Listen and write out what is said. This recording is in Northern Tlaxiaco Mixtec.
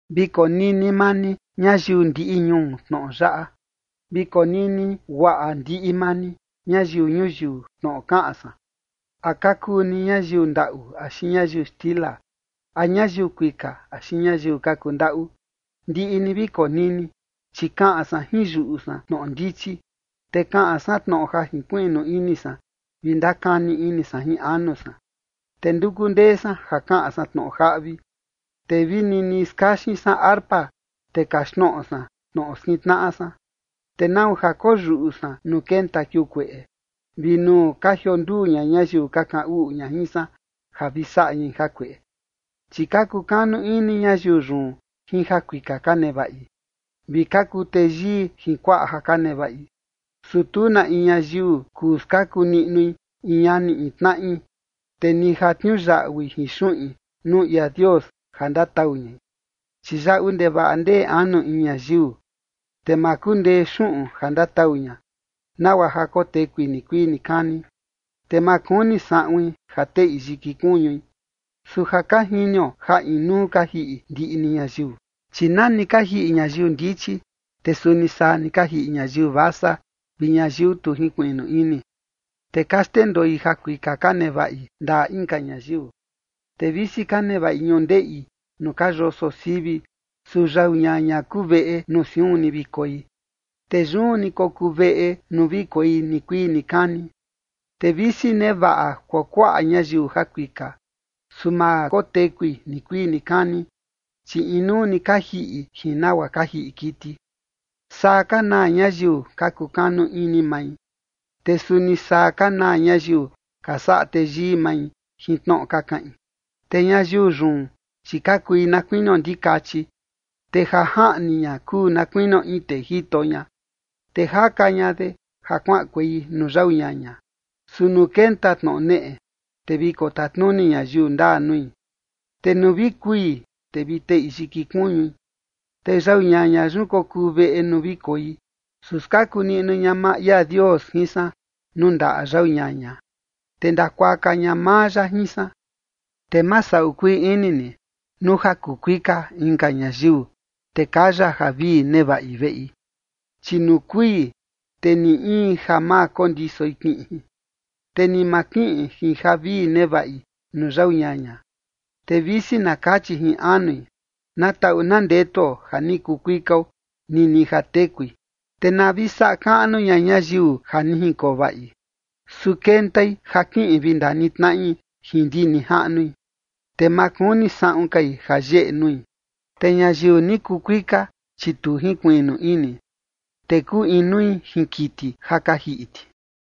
Vi konini maa ni ñayiu ndiꞌi ñuu tnoꞌo yaꞌa. Vi konini guaꞌa ndiꞌi maa ni, ñayiu ñuyiu, tnoꞌo kaꞌan san. A ka kuu ni ñayiu ndaꞌu axi ñayiu xtila, a ñayiu kuika axi ñayiu ka kundaꞌu, ndiꞌi ni vi konini. Chi kaꞌan san jin yuꞌu san tnoꞌo ndichi, te kaꞌan san tnoꞌo ja jinkuiꞌnu ini san vi ndakani ini san jin anu san. Te nduku ndee san ja kaꞌan san tnoꞌo jaꞌvi, te vi nini skaxin san arpa, te kaxtnoꞌo san tnoꞌo skintnaꞌa san. ¿Te nau ja koyuꞌu san nuu kenta kiuu kueꞌe vi nuu ka jionduu ña ñayiu ka kaꞌan uꞌu ña jin san ja vi saꞌa ñai jakueꞌe? Chi ka kukanu ini ñayiu yun jin jakuika ka nevaꞌi, vi ka kuu teyii jin kuaꞌa ja ka nevaꞌi. Su tu na in ñayiu kuu skaku niꞌnui in ñani in tnaꞌi, te ni ja tniuyaꞌui jin xuꞌin nuu ia Dios ja ndatau ñai. Chi yaꞌu ndevaꞌa ndee anu in ñayiu, te ma kundee xuꞌun ja ndatau ña, nagua ja kotekui nikuii nikani, te ma kuni saꞌuin ja teꞌi yiki kuñui. Su ja ka jinio ja inuu ka jiꞌi ndiꞌi ni ñayiu. Chi na ni ka jiꞌi ñayiu ndichi, te suni saa ni ka jiꞌi ñayiu vasa vi ñayiu tu jinkuiꞌnu ini, te ka xndendoi jakuika ka nevaꞌi ndaꞌa inka ñayiu. Te visi ka nevaꞌi ñundeꞌi nuu ka yoso sivi, su yau ñaña kuu veꞌe nuu siun ni vi koi, te yun ni kokuu veꞌe nuu vi koi nikuii nikani. Te visi nevaꞌa kuakuaꞌa ñayiu jakuika, su ma kotekui nikuii nikani, chi inuu ni ka jiꞌi jin nagua ka jiꞌi kiti. Saa ka naa ñayiu ka kukanu ini mai, te suni saa ka naa ñayiu ka saꞌa teyii mai jin tnoꞌo ka kaꞌin. Te ñayiu yun, chi ka kui na kuinio ndikachi, te ja jaꞌni ña kuu na kuinio in tee jito ña, te jaka ña de ja kuaꞌankuei nuu yau ñaña. Su nuu kenta tnoꞌo neꞌe, te vi kotatnuni ñayiu ndaa nui, te nuu vi kui, te vi teꞌi yiki kuñui, te yau ñaña yun kokuu veꞌe nuu vi koi. Su skaku niꞌnu ña maa ia Dios jin san nuu ndaꞌa yau ñaña, te ndakuaka ña maa ya jin san. Te ma saꞌu kuii ini ni nuu ja kuu kuika inka ñayiu, te kaya javii nevaꞌi veꞌi. Chi nuu kui, te ni in ja ma kondisoi kiꞌin jin, te ni ma kiꞌin jin javii nevaꞌi nuu yau ñaña. Te visi na kachi jin anui: “Na taꞌu na ndetuo ja ni kuu kuikao”, nini ja tekui, te na vi saꞌa kaꞌnu ña ñayiu ja ni jinkoo vaꞌi, su kentai ja kiꞌin vi ndanitnaꞌi jin ndi nijaꞌnui, te ma kuni saꞌun kai ja yeꞌe nui. Te ñayiu ni kuu kuika, chi tu jinkuiꞌnu ini, te kuu inui jin kiti ja ka jiꞌi ti.